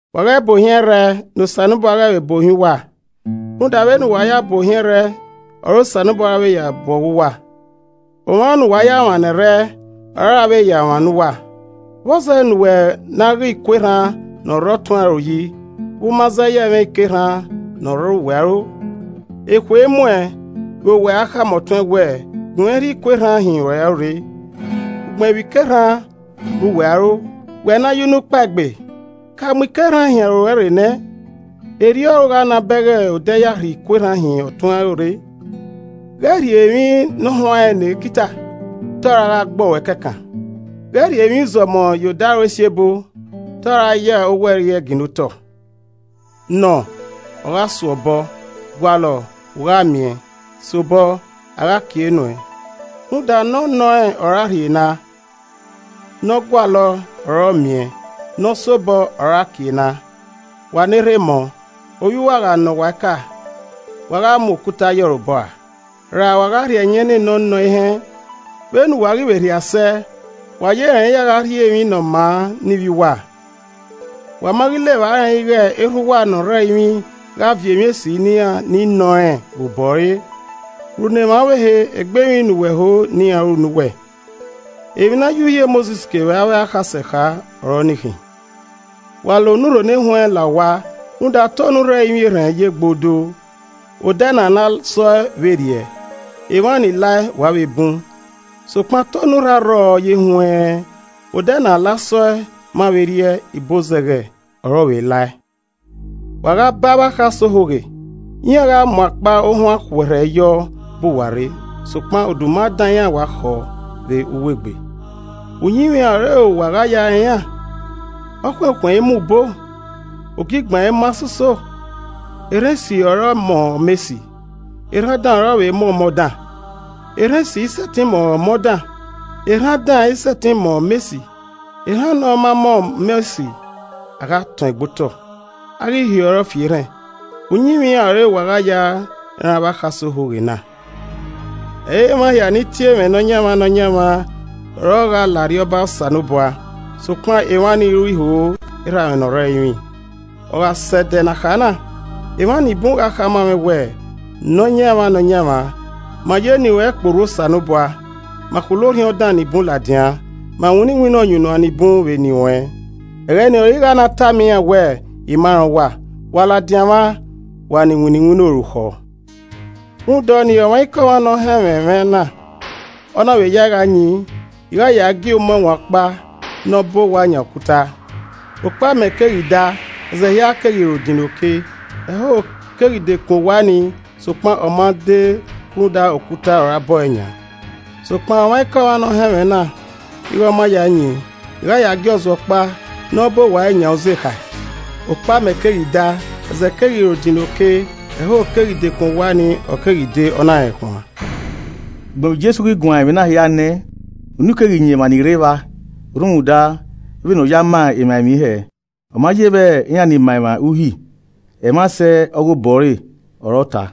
“Wa ghẹ buohiẹn ẹrrẹ, ne Osanobua ghẹ vbe bu ohiẹn uwa. Rhunmwuda vbene uwa ya bu ohiẹn ẹrrẹ, ọre Osanobua ra vbe ya bu ọghe uwa. Omwa ne uwa ya mwa ne ẹrrẹ, ọre a ra vbe ya mwa ne uwa. Vbọzẹ ne uwẹ na ghe iku erhan ne ọ rre ọtuẹn aro yi vbe u ma zẹye ẹmwẹ ike erhan ne ọ rre uwẹ aro? Ekhue imuẹn vbe uwẹ a khama ọtuẹn wẹẹ, ‘Gunmwẹ rhie iku erhan hin ruẹn aro rre,’ ugbẹn vbe ike erhan rre uwẹ aro? Wẹ ne ayunukpaegbe! Ka mu ike erhan hin aro ruẹ rre nẹ, erriọ ọre u gha na bẹghe odẹ ya rhie iku erhan hin ọtuẹn aro rre. “Ghẹ rhie emwi nọhuanrẹn ne ekita, te ọ ra gha gbọọ ruẹ kẹkan. Ghẹ rhie emwi uzọmọ ye odaro esiebo, te ọ ra ya owẹ rri ẹe ginna otọ. “Nọọn, ọ gha suọ obọ, gualọ, u gha miẹn, sobọ, a gha kie nuẹn. Rhunmwuda ne ọ nọrẹn ọre a rhie na, ne ọ gualọe ọre ọ miẹn, ne ọ sobọ ọre a kie na. Wa ne erha emọ, ovbi uwa gha nọ uwa eka, wa gha mu okuta ye ọre obọ ra. Ra wa gha rhie ẹyẹn ne ne ọ nọ ehẹn? Vbene uwa ghi vbe rhia sẹ, wa ye rẹn ya gha rhie emwi ne ọ maa ne ivbi uwa, wa ma ghi la evba rẹn ighe Erha uwa ne ọ rre ẹrinmwi gha viọ emwi esi ne iran ni nọrẹn vbe obọ ẹre. “Ru ne emwa ọvbehe egbe emwi ne uwẹ ho ne iran ru ne uwẹ. Emwi na ya Uhi Mosis kevbe avbe akhasẹ kha ọre ọnii khin. “Wa la onurho ne wẹnrẹn la owa, rhunmwuda, te onurho ẹrinmwi erhẹn ye gbodoo, odẹ ne a la sọe vbe rriẹ, emwa ni lae wa vbe bun. Sokpan te onurho arrọọ ye wẹnrẹn, odẹ ne a la sọe ma vbe rriẹ, ibozẹghẹ ọre ọ vbe lae. “Wa gha ba avbe akhasẹ ohoghe. Iran gha mu akpa ohuan khuẹrhẹ yọ bu uwa rre, sokpan oduma dan iran wa khọ vbe uwu egbe. Uyinmwẹ iran ọre uwa gha ya rẹn iran. Ọkhuẹnkhuẹn i mọ azara ra ne ogigban mọ ohọ. Erhan esi ọre ọmọ ọmọ esi, erhan dan ọre ọ vbe mọ ọmọ dan. Erhan esi i sẹtin mọ ọmọ dan, erhan dan i sẹtin mọ ọmọ esi. Erhan ne ọ ma mọ ọmọ esi, a gha tọẹn gbe otọ, a ghi hiọrọe fi erhẹn. Uyinmwẹ iran ọre uwa gha ya rẹn avbe akhasẹ ohoghe na. “Ẹ i re emwa hia ni tie mwẹ ‘Nọyaẹnmwa, Nọyaẹnmwa’ ọre ọ gha la Arriọba Osanobua, sokpan emwa ni ru iho erha mwẹ ne ọ rre ẹrinmwi. Ogha sẹ ẹdẹ ne a kha na, emwa nibun gha khama mwẹ wẹẹ, ‘Nọyaẹnmwa, Nọyaẹnmwa, ma ya eni ruẹn kporhu Osanobua. Ma khulo orhiọn dan nibun ladian. Ma winna iwinna ọyunnuan nibun vbe eni ruẹn.’ Ẹghẹ ni ọre I gha na tama iran wẹẹ, ‘I ma rẹn uwa, wa ladian mwa, wa ni winna iwinna orukhọ.’ “Rhunmwuda ọnii, ọmwaikọmwa ne ọ họn ẹmwẹ mwẹ na, ọ na vbe yae gha yin, I gha yae gie umẹwaẹn ọkpa ne ọ bọ owa yan okuta. Okpamẹ keghi daa, ezẹ hia keghi ro dinna oke, ẹhoho keghi dekun owa ni, sokpan ọ ma de rhunmwuda okuta ọre a bọe yan. Sokpan ọmwaikọmwa ne ọ họn ẹmwẹ na ighe ọ ma yae yin, I gha yae gie ọzuọ ọkpa ne ọ bọ owa ẹre yan uzekhae. Okpamẹ keghi daa, ẹzẹ hia keghi ro dinna oke, ẹhoho keghi dekun owa ni, ọ keghi de, ọ na rẹnkhuan.” Ugbẹn vbe Jesu ghi guan ẹmwẹ na hia nẹ, unu keghi yan emwa ni rre evba rhunmwuda, vbene ọ ya ma emwa emwi hẹ. Ọ ma ye vbe iran ni ma emwa Uhi. Ẹmwẹ asẹ ọghe obọ ẹre ọre ọ ta.